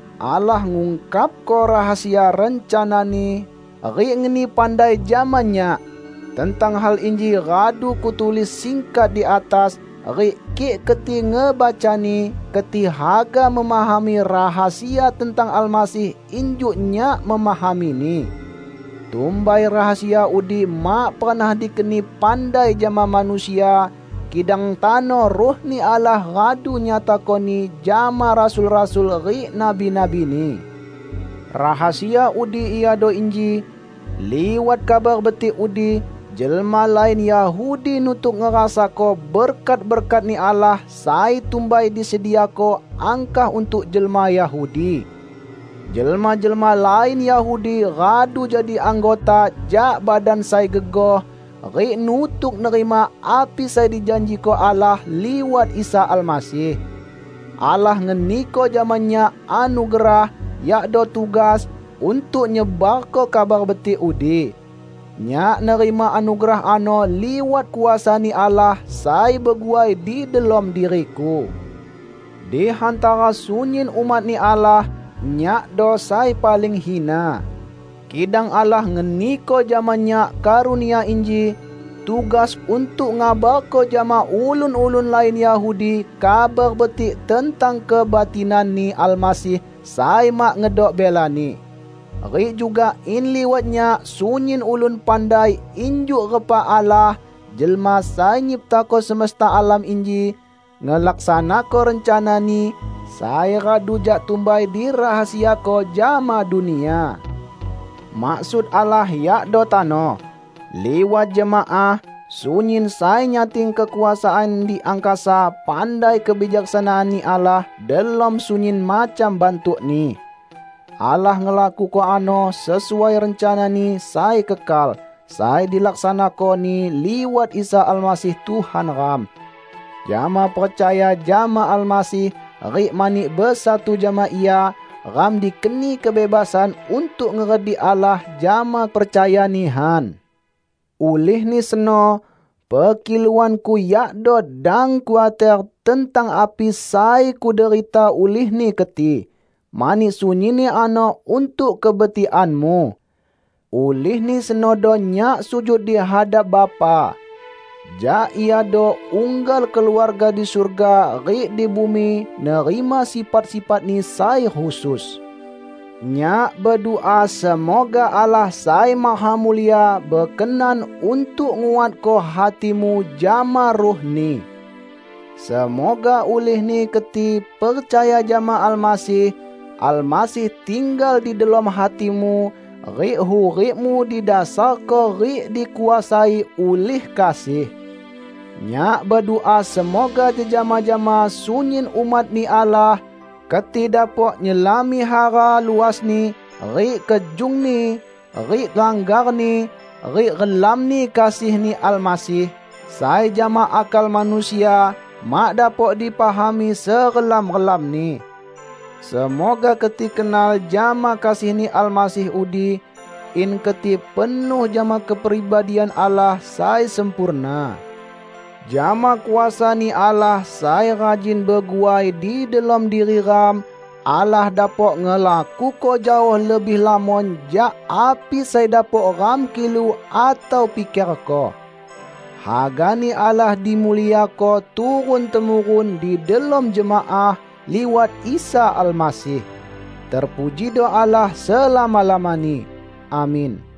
Allah ngungkapko rahasia rencana-Ni rik ngeni pandai jama nyak. (Tentang hal inji radu kutulis singkat di atas, rik kik keti ngebacani, keti haga memahami rahasia tentang Almasih injuk nyak memahamini.) Tumbai rahasia udi mak pernah dikeni pandai jama manusia, kidang tano Ruh-Ni Allah radu nyatakoni jama rasul-rasul rik nabi-nabi-Ni. Rahasia udi iado inji: Liwat Kabar Betik udi, jelma lain Yahudi nutuk ngerasako berkat-berkat-Ni Allah sai tumbai disediako angkah untuk jelma Yahudi. Jelma-jelma lain Yahudi radu jadi anggota jak badan sai gegoh, rik nutuk nerima api sai dijanjiko Allah liwat Isa Almasih. Allah ngeniko jama nyak anugerah -- yakdo tugas -- untuk nyebarko Kabar Betik udi. Nyak nerima anugerah ano liwat kuasa-Ni Allah sai beguai di delom diriku. Di hantara sunyin umat-Ni Allah, nyakdo sai paling hina. Kidang Allah ngeniko jama nyak karunia inji: tugas untuk ngabarko jama ulun-ulun lain Yahudi Kabar Betik tentang kebatinan-Ni Almasih sai mak ngedok belani; rik juga in liwat nyak sunyin ulun pandai injuk repa Allah, Jelma Sai Nyiptako semesta alam inji, ngelaksanako rencana-Ni sai radu jak tumbai dirahasiako jama dunia. Maksud Allah yakdo tano, liwat jemaah, sunyin sai nyating kekuasaan di angkasa pandai kebijaksanaan-Ni Allah delom sunyin macam bantukni. Allah ngelakuko ano sesuai rencana-Ni sai kekal, sai dilaksanako-Ni liwat Isa Almasih Tuhan ram. Jama percaya jama Almasih rik mani besatu jama Ia, ram dikeni kebebasan untuk ngeredik Allah jama percaya nihan. Ulihni seno, pekiluanku yakdo: dang khuater tentang api sai kuderita ulihni keti, mani sunyinni ano untuk kebetikanmu. Ulihni senodo nyak sujud di hadap Bapa. Jak Iado unggal keluarga di surga rik di bumi nerima sifat-sifat-Ni sai khusus. Nyak bedua semoga Allah sai mahamulia bekenan untuk nguatko hatimu jama Ruh-Ni. Semoga ulihni keti percaya jama Almasih, Almasih tinggal di delom hatimu, rik hurikmu didasarko rik dikuasai ulih kasih. Nyak bedua semoga jejama jama sunyin umat-Ni Allah, keti dapok nyelami hara luasni rik kejungni rik langgarni rik relamni kasih-Ni Almasih, sai jama akal manusia mak dapok dipahami serelam-relamni. Semoga keti kenal jama kasih-Ni Almasih udi, in keti penuh jama kepribadian Allah sai sempurna. Jama kuasa-Ni Allah sai rajin beguai di delom diri ram, Allah dapok ngelakuko jaoh lebih lamon jak api sai dapok ram kilu atau pikerko. Hagani Allah dimuliako turun-temurun di delom jemaah, liwat Isa Almasih. Terpujido Allah selama-lamani! Amin.